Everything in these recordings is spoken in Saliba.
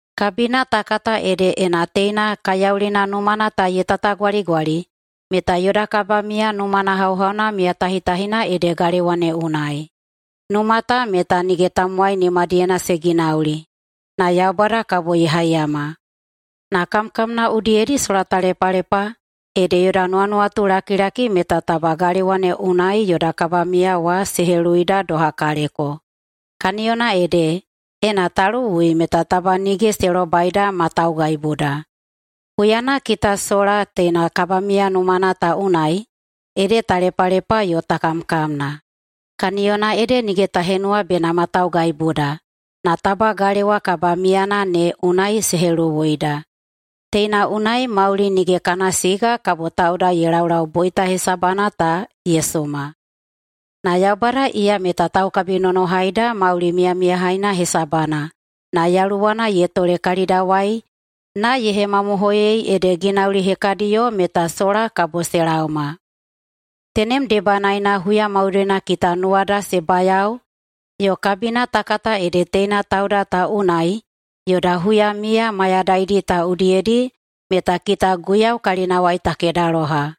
Kabina ta kata ede ena teina kaiyaulina numana ta ye tatagwaligwali meta yoda kabamiya numana hauhauna miyamiyatahitahina ede galewa ne unai. Numa ta meta nige tamowai nimadiyena se ginauli, na Yaubada kabo ye haiyama. Na kamkamna udiyedi sola ta lepalepa, ede yoda nuwanuwatulakilaki meta taba galewa ne unai yoda kabamiya wa se heluwuida doha kaleko. Kaniyona ede, ena ta luwui meta taba nige se lobaida ma taugaibuda. Huyana kita sola teina kabamiya numana ta unai, ede ta lepalepa yo ta kamkamna. Kaniyona ede nige ta henuwa bena ma taugaibuda, na taba galewa kabamiyana ne unai se heluwuida. Teina unai mauli nige kana siga kabo tauda ye laulau boita hesabana ta ye suma. Na Yaubada iya meta taukabinonohaida mauli miyamiyahaina hesabana na Yaluwana ye tole kalidawai na ye hemamohoiyei ede ginauli hekadiyo meta sola kabo se laoma. Tenem debanaena huya maudoina kita nuwada se bayao yo kabina ta kata ede teina tauda ta unai yoda huyamiya mayadaidi ta udiyedi meta kita Guiyau kalinawai ta kedaloha.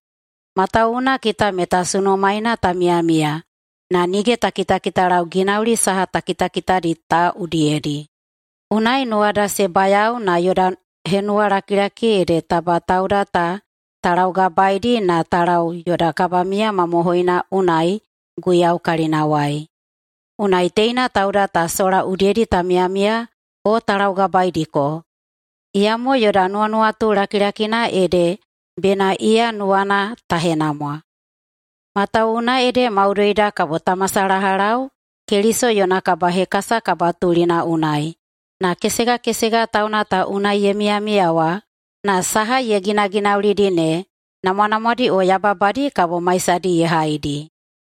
Matawuwuna kita meta sunumaena ta miyamiya na nige ta kitakitalau ginauli saha ta kitakitadi ta udiyedi. Unai nuwada se bayao na yoda henuwalakilaki ede taba tauda ta ta laugabaeidi na ta lau yoda kabamiya mamohoina unai Guiyau kalinawai. Unai teina tauda ta sola udiyedi ta miyamiya o ta laugabaeidiko, iyamo yoda nuwanuwatu lakilakina ede bena iya nuwana ta henamwa. Matawuwuna ede maudoida kabo ta masalahalau Keliso yona kabahekasa kabatulina unai, na kesegakesega tauna ta unai ye miyamiya wa na saha ye ginaginaulidi ne, namwanamwadi o yababadi, kabo maisadi ye haidi.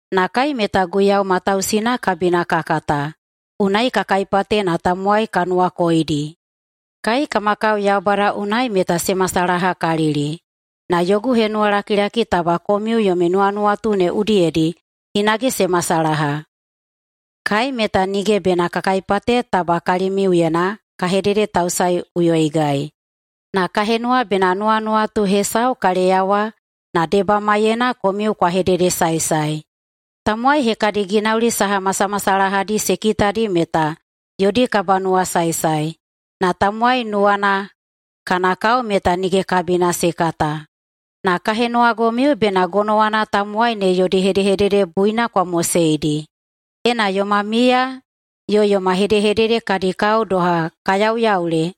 Na kai meta Guiyau matausina kabina ka kata, unai ka kaipate na tamowai ka nuwakoidi. Kai kama kao Yaubada unai meta se masalahakalili, na yogu henuwalakilaki taba komiu yomi nuwanuwatu ne udiyedi hinage se masalaha. Kai meta nige bena ka kaipate taba kalimiuyena ka hededetausaeꞌuyoigai, na ka henuwa bena nuwanuwatu hesau ka leyawa na debamaiyena komiu kwa hededesaesae. Tamowai hekadi ginauli saha masamasalahadi se kitadi meta yodi kabanuwasaesae, na tamowai nuwana kana kao meta nige kabina se kata. Na ka henuwagomiu bena gonowana tamowai ne yodi hedehedede buina kwa moseidi. Ena yoma miya yo yoma hedehedede kadi kao doha ka yauyaule,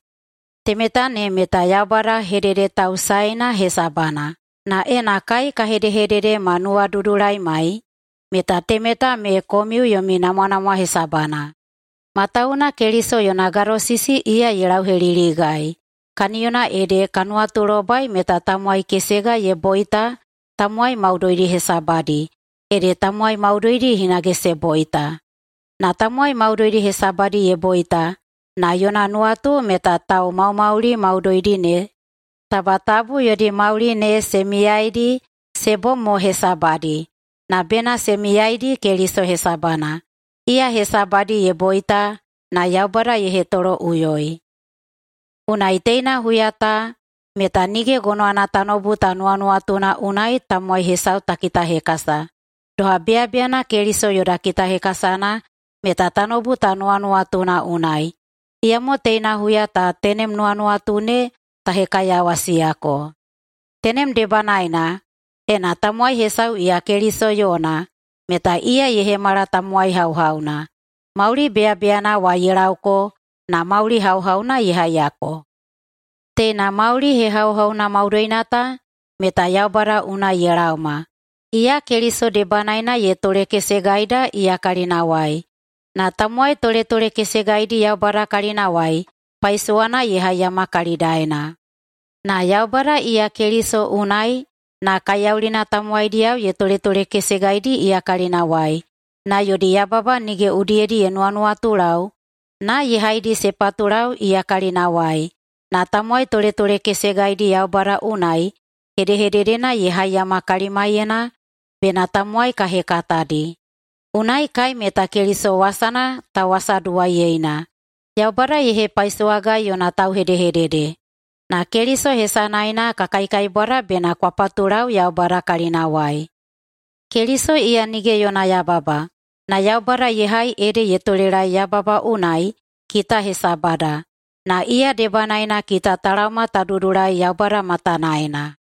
temeta ne meta Yaubada hededetausaeina hesabana. Na ena kai ka hedehedede ma nuwadudulaimai, meta temeta ne komiu yomi namwanamwa hesabana. Matawuwuna Keliso yona gadosisi iya ye lauheliligai, kaniyona ede ka nuwatulobai meta tamowai kesega ye boita tamowai maudoidi hesabadi, ede tamowai maudoidi hinage se boita. Na tamowai maudoidi hesabadi ye boita, na yona nuwatu meta taumaumauli maudoidi ne taba tabu yodi mauli ne se miyaeidi se bom mo hesabadi, na bena se miyaeidi Keliso hesabana, iya hesabadi ye boita na Yaubada ye hetoloꞌuyoi. Unai teina huya ta meta nige gonowana tanoubu ta nuwanuwatuna unai tamowai hesau ta kitahekasa. Doha beyabeyana Keliso yoda kitahekasana meta tanoubu ta nuwanuwatuna unai, iyamo teina huya ta tenem nuwanuwatu ne ta hekaiyawasiyako. Tenem debanaena, ena tamowai hesau iya Keliso yona, meta iya ye hemala tamowai hauhauna. Mauli beyabeyana wa ye laoko na mauli hauhauna ye haiyako. Teina mauli hehauhauna maudoina ta meta Yaubada unai ye laoma, iya Keliso debanaena ye tolekesegaida iya kalinawai, na tamowai toletolekesegaidi Yaubada kalinawai paisowana ye haiyama kalidaena. Na Yaubada iya Keliso unai na kaiyaulina ta tamowaidiyao ye toletolekesegaidi iya kalinawai na yodi yababa nige udiyedi ye nuwanuwatulau na ye haidi se patulau iya kalinawai, na tamowai toletolekesegaidi Yaubada unai hedehededena ye haiyama kalimaiyena bena tamowai ka hekatadi. Unai kai meta Keliso wasana tauwasaduwaiyeina, Yaubada ye hepaisowagai yona tauhedehedede. Na Keliso hesanaena ka kaikaibwada bena kwa patulau Yaubada kalinawai. Keliso iya nige yona yababa, na Yaubada ye hai ede ye tolelaei yababa unai kita hesabada, na iya debanaena kita ta laoma ta dudulai Yaubada matanaena.